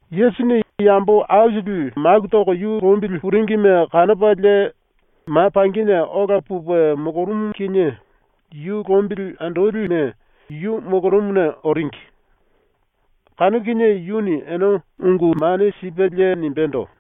Yesusini yambo aisili maku toko yu lombili puringime kanopalie ma pangine ola pupe molorumu kinie yu lombili andolime yu molorumuna oringi. Kanu kinie yuni ene ungu mane sipelie nimbendo: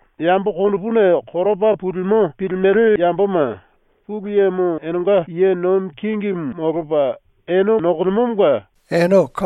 “Yambo konopuna koropa pulimo pilimele yamboma Pulu Yemo enenga ye nomi kingimu molopa ene nokolemomonga ene malo.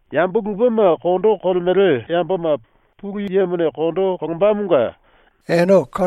“Yambo lupema kondo kolemele yamboma Pulu Yemone kondo kolombamonga ene malo.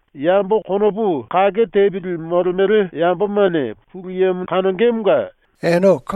“Yambo konopu kake tepili molemele yambomane Pulu Yemo kanongemonga ene malo.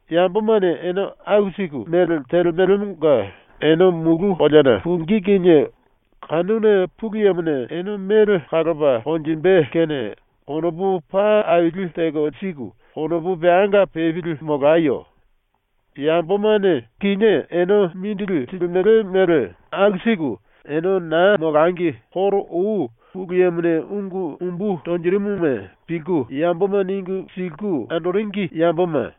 ⸤Yambomane ene aku siku mele telemelemonga⸥ ene mulu koleana pungí kinie kanuna Pulu Yemone ene mele kalopa konjimbe kene konopu paa aili teko siku konopu peanga pepili molayo. Yambomane kinié ene mindili silimele mele aku siku ene na molangi koro ou Pulu Yemone ungu umbu tonjirimuma pilku yamboma ningu siliku andoringi yamboma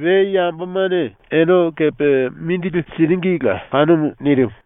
we yambomane ene kepe mindili siringila kanumu.” ⸤nirimu.⸥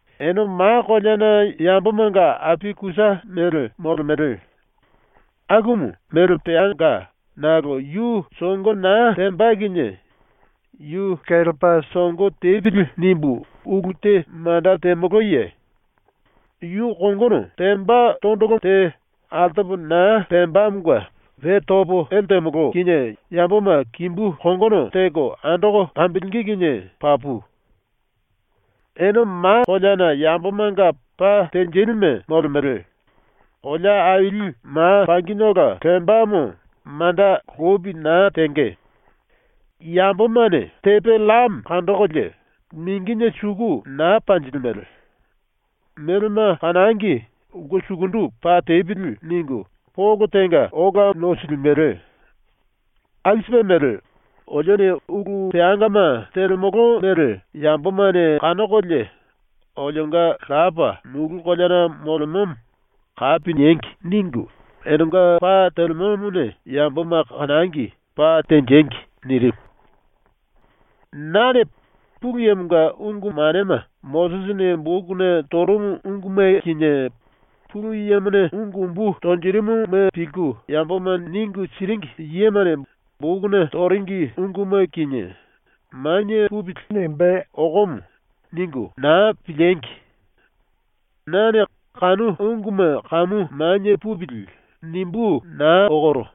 “Ene ma koleana yambomanga api kusa mele molemele. ⸤Akumu mele peanga⸥ nakolo yu songo na temba kinie ‘Yu kelepa songo tepili.’ nimbu ulu te manda temoloye? Yu kongono temba tondolo te altopa na pembamonga we topo ele temolo kinie yamboma kimbu kongono teko andoko kambilingí kinie papu. “Ene ma koleana yambomanga pa tenjilime molemele. Kolea aili ma pangine ola lembamo manda lopi na tenge. Yambomane tepe llame kandokolie mingine suku na panjilimele. ‘Melema kanangi, ulke sukundu pa tepili.’ ningu polo tenga ola nosilimele. Aku sipe mele ‘Olione ulu peangama telemolo mele yambomane kanokolie olionga Lapa, mulu koleana molemomo, kapi niengi.’ ningu enenga pa telemomone yamboma kanangi, pa tenjengi.” ⸤nirimu.⸥ “Nane ‘Pulu Yemonga ungu manema ⸤Mosisini⸥ bokuna torumu unguma kinie Pulu Yemone ungu umbu tonjirimuma pilku yamboma ningu siringi yemane bokuna toringi unguma kinie ‘manie pupili.’ nimbé okomo.’ ningu na piliengi! Nane ‘Kanu unguma kamu manie pupili.’ nimbú naa okoro.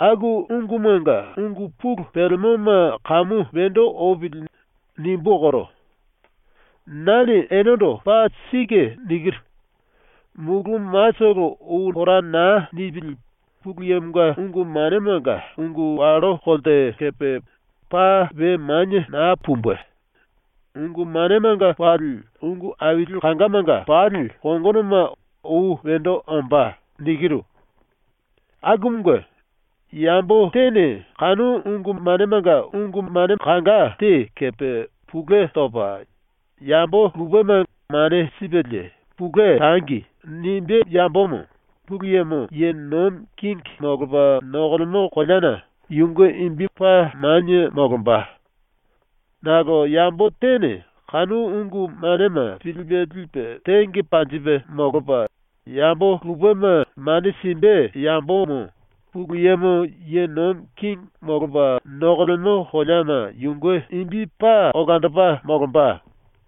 ‘Aku ungumanga ungu pulu pelemoma kamu wendo opili.’ nimbú okoro. Nane enendo paa sike nikiru: Mulu matolo ou pora na nipili Pulu Yemonga ungu manemanga ungu wallo kolte kepe paa we manie na pumbe. Ungu manemanga pali ungu aili kangamanga pali kongonoma ou wendo ombá. Akumunge, yambo tene kanu ungu manemanga ungu mane kanga te kepe pulue topa, yambo lupema mane sipelie “Pulue tangi.” nimbé yambomo Pulu Yemo ye nomi kingi molopa nokolemo koleana yunge imbi paa manie molomba. Nakolo yambo tene kanu ungu manema pilipe lipe tenge panjipe molopa, yambo lupema mane simbe yambomo Pulu Yemo ye nomi kingi molopa nokolemo koleana yunge imbi paa olandopa molomba.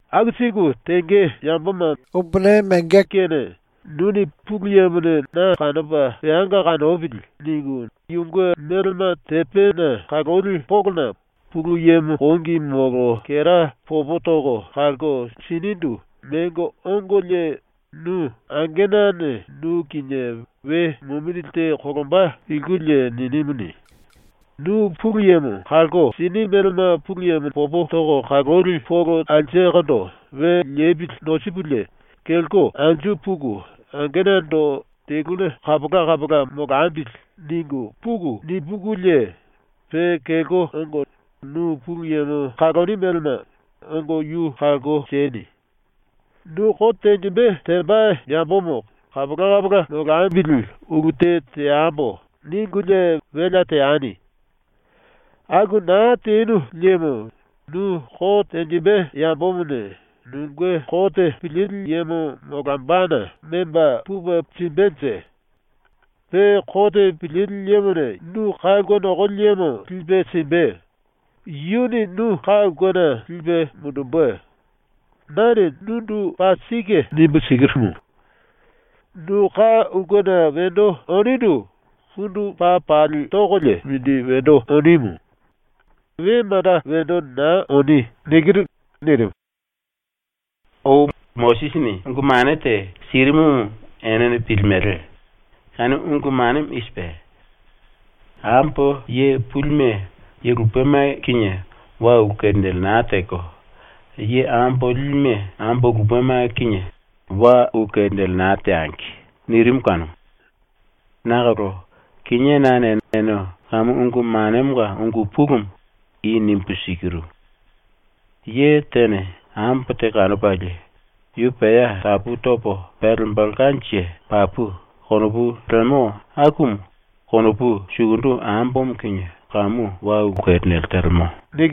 “Aku siku tenge yamboma mongo lingí kene nuni ‘Pulu Yemone na kanopa peanga kanopili.’ ningu yunge melema tepena kaloli polona Pulu Yemo kongi molo kera popo toko kalko sinindu mengo ongolie nu angenane nu kinie we mumindili te kolomba pilkulie ninimuni, nu Pulu Yemo kalko sini melema Pulu Yemo popo toko kaloli polo alsekondo we lepili nosikulie kelko anju puku angenando “Teluna kapola kapola molambili.” ningu puku nipukulie, pe kelko ongo nu Pulu Yemo kaloni melema ongo yu kalko sieni. “Nu kote tenjimbe temba yambomo ‘Kapola kapola molambili ulu te teambo.’ ningulie welea teani. Aku na tenu liemo nu kote tenjimbe yambomone nunge kote pilili yemo molombana memba pupe simbenje. Pe kote pilili yemone nu ka ulke nokoli yemo lipe simbe, yuni nu ka ulkena lipe mundumbe. Nane nundu paa sike nimbu sikirumu: Nu ka ulkena wendo onindu pundu paa pali tokolie mindi wendo onimu. We manda wendo na oni.” ⸤nirimu.⸥ “⸤Ou Mosisini⸥ ungu mane te sirimumu ene pilimele. Kanu ungu manemo i sipe: ‘Ambo ye pulime ye lupema kinie wa ulu kerinele na teko, ye ambo lilime ambo lupema kinie wa ulu kerinele na teangi.’ nirimu kanumu. Nakolo kinié nane ene ⸤kanu ungu manemonga ungu pulumu⸥ i nimbu sikiru: Ye tene ambo te kanopalie ‘Yu pea tapu topo pelembelkanje papu.’ konopu lemo akumu konopu sukundu ambomo kinie kamu wa ulu kerinele telemo.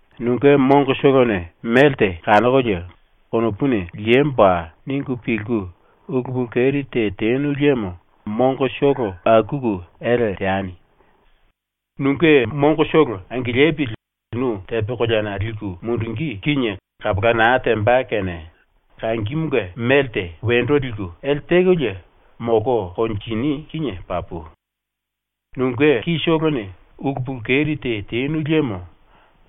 Nunge mongotolone melte kanokolie konopuni ‘Liemboa.’ ningu pilku ulu pulu keri te tenu liemo mongotolo akuku ele teani. Nunge mongotolo angilipili nu tepe koleana liku mundungí kinie kapola na temba kene kangimunge melte wendo liku ele tekolie molko konjini kinie papu. Nunge kitolone ulu pulu keri te tenu liemo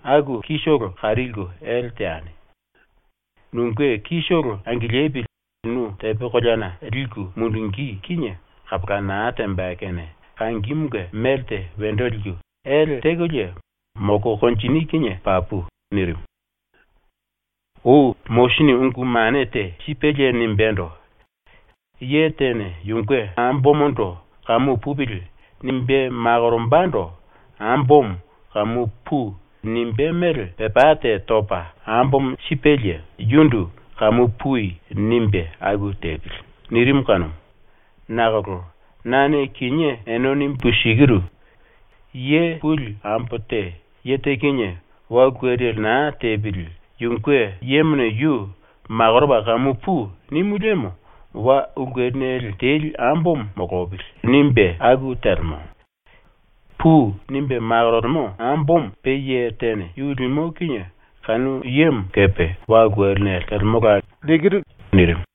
aku kitolo kari lelko ele teani. Nunge kitolo angilipili nu tepe koleana liku mundungí kinie kapola na temba kene kangimunge melte wendo liku ele tekolie molko konjini kinie papu.” ⸤nirimu.⸥ “⸤Ou Mosisini⸥ ungu mane te sipelie nimbendo: “Ye tene yunge ambomondo ‘Kamu pupili.’ nimbe makorombando ambomo “Kamu pui.” nimbé mele pepá te topa ambomo sipelie yundu “Kamu pui.” nimbe aku tepili.” nirimu kanumu. Nakolo nane kinié ene nimbu sikiru: Ye puli ambo te ye te kinie wa ulu kerinele na tepili yunge yemone yu makoropa “Kamu pui.” nimu liemo ‘Wa ulu kerinele teli ambomo molopili.’ nimbe aku telemo. “Pui.” nimbe makorolemo ambomo pe ye tene yu limo kinie kanu yemo kepe wa ulu kerinele telemola.” ⸤nirimu.⸥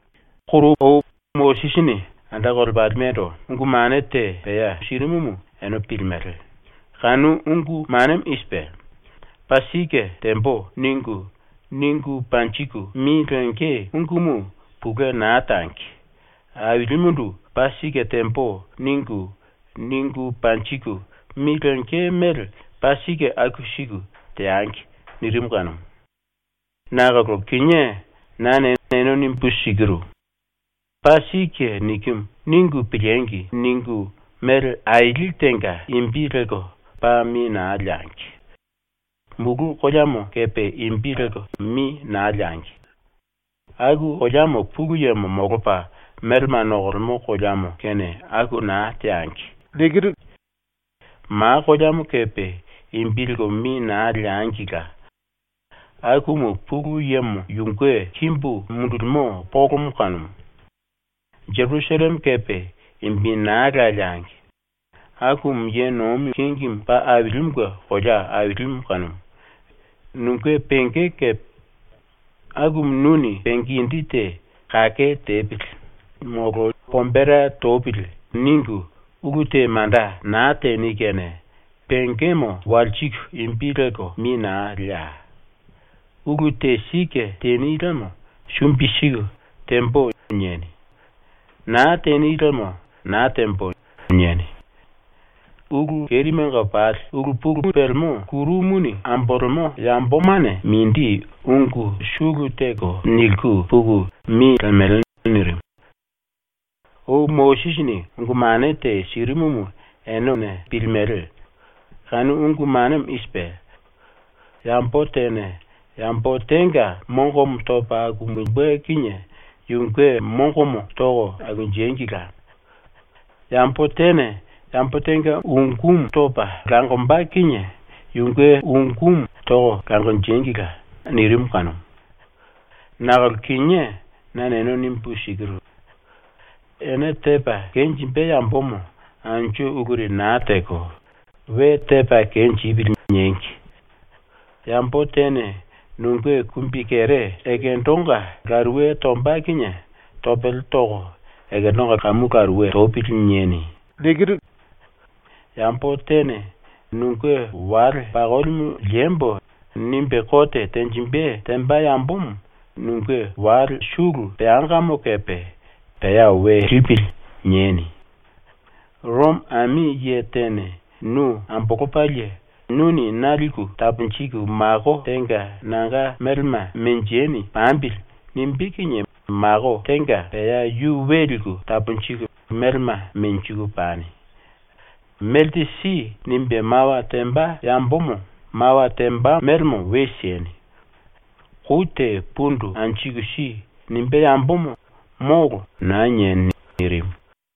“Koro ou ⸤Mosisini⸥ anda kolepalimendo ungu mane te pea sirimumu ene pilimele. Kanu ungu manemo i sipe: ‘ “Paa sike tembo.” ningu, ningu panjiku mi lenge ungumu pulue na tangi. Ailimundu “Paa sike tembo.” ningu, ningu panjiku mi lenge mele paa sike aku siku teangi.’ nirimu kanumu. Nakolo kinié nane ene nimbu sikiru: ‘ ‘Paa sike nikimu.’ ningu piliengi!’ ningu mele aili tenga imbi lelko paa mi na leangi. Mulu koleamo kepe imbi lelko mi na leangi. Aku koleamo Pulu Yemo molopa melema nokolemo koleamo kene aku na teangi. Ma koleamo kepe imbi lelko mi na leangila. Akumu Pulu Yemo yunge kimbu mundulimo polomo kanumu. Jerusalleme kepe imbi naa la leangi. Akumu Ye Nomi Kingi Paa Ailimunge kolea ailimu kanumu. Nunge penge kepe. Akumu nuni penge indi te ‘Kake tepili.’ molo ‘Pombera topili.’ ningu ulu te manda na teni kene pengemo walsiku imbi lelko mi na leai. Ulu te sike teni liemo sumbi siku “Tembo.” nieni. Naa teni liemo “Naa tembo.” nieni. Ulu kerimenga pali ulu pulumu pelemo ⸤kuru⸥ muni ambolemo yambomane mindi ungu sulu teko niliku puku mi lemele.” ⸤nirimu.⸥ “⸤Ou Mosisini⸥ ungu mane te sirimumu ene pilimele. Kanu ungu manemo i sipe: “Yambo tene yambo tenga mongomo topa akumbe kinie yunge mongomo toko akunjengila. Yambo tene yambo tenga ungú topa langomba kinie yunge ungú toko langonjengila.” nirimu kanumu. Nakolo kinié nane ene nimbu sikiru: Ene tepa kenjimbe yambomo anju uluri na teko, ‘We tepa kenjipili.’ niengi. Yambo tene nunge kumbikere ekendonga laruwe tomba kinie topele toko ‘ekendonga kamu laruwe topili.’ nieni. Yambo tene ‘Nunge wale pakolimu liembo.’ nimbe kote tenjimbe temba yambomo nunge wale sulu peangamo kepe ‘pea we lipili.’ nieni. ⸤Romo ami⸥ ye tene nu ambolopalie “Nuni na liku taponjiku mako tenga ⸤nanga melema menjeni⸥ pambili.” nimbé kinie mako tenga pea yu we liku taponjiku melema menjiku pani. “Melte si.” nimbe mawa temba yambomo mawa temba melemo we sieni. “Kou te pundu anjiku si.” nimbé yambomo “Molo.” na nieni.” ⸤nirimu.⸥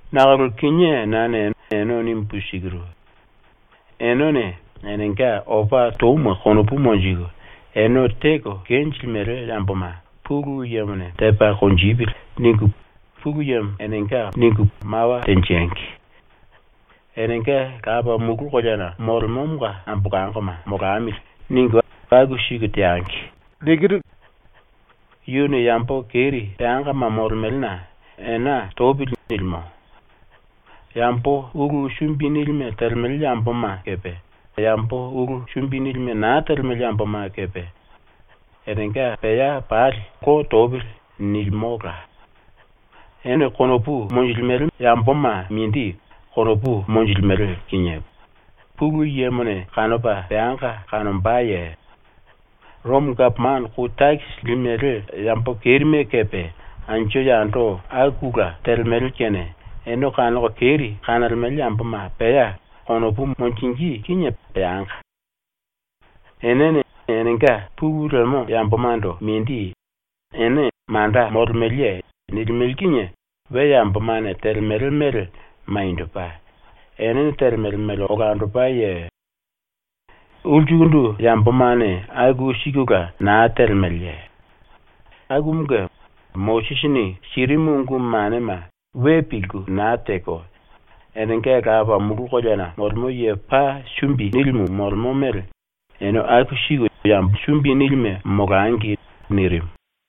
Nakolo kinié nane ene nimbu sikiru: Enene enenga opa touma konopu monjiku, ene teko kenjilimele yamboma ‘Pulu Yemone tepa konjipili.’ ningu Pulu Yemo enenga mawa tenjengi. Enenga ‘Lapa mulu koleana molemomonga ambolangoma molamili.’ ningu aku siku teangi. Yuni yambo keri peangama molemelena ‘Ena topili.’ nilimo. Yambo ulu sumbi nilime telemele yamboma kepe yambo ulu sumbi nilime na telemele yamboma kepe enenga pea pali ‘Lo topili.’ nilimola. “Ene konopu monjilimele yamboma mindi konopu monjilimele kinie Pulu Yemone kanopa peanga kanombaye? ⸤Romo gapomano⸥ kou takisi limele yambo ⸤kerime⸥ kepe anju yando akula telemele kene ⸤ene kanoko keri kanolemele yamboma pea konopu monjingí kinie peanga⸥. Enene enenga pulu lemo yambomando mindi “Ene manda molemeleye?” nilimele kinie we yambomane telemele mele maniendopa, enene telemele mele olandopaye? Ulsukundu yambomane aku sikula na telemeleye? Akumunge ⸤Mosisini sirimu ungu manema we pilku na teko,⸥ enenga Lapa mulu koleana molemo ye paa sumbi nilimu molemo mele ene aku siku yambo sumbi nilime molangi.” ⸤nirimu.⸥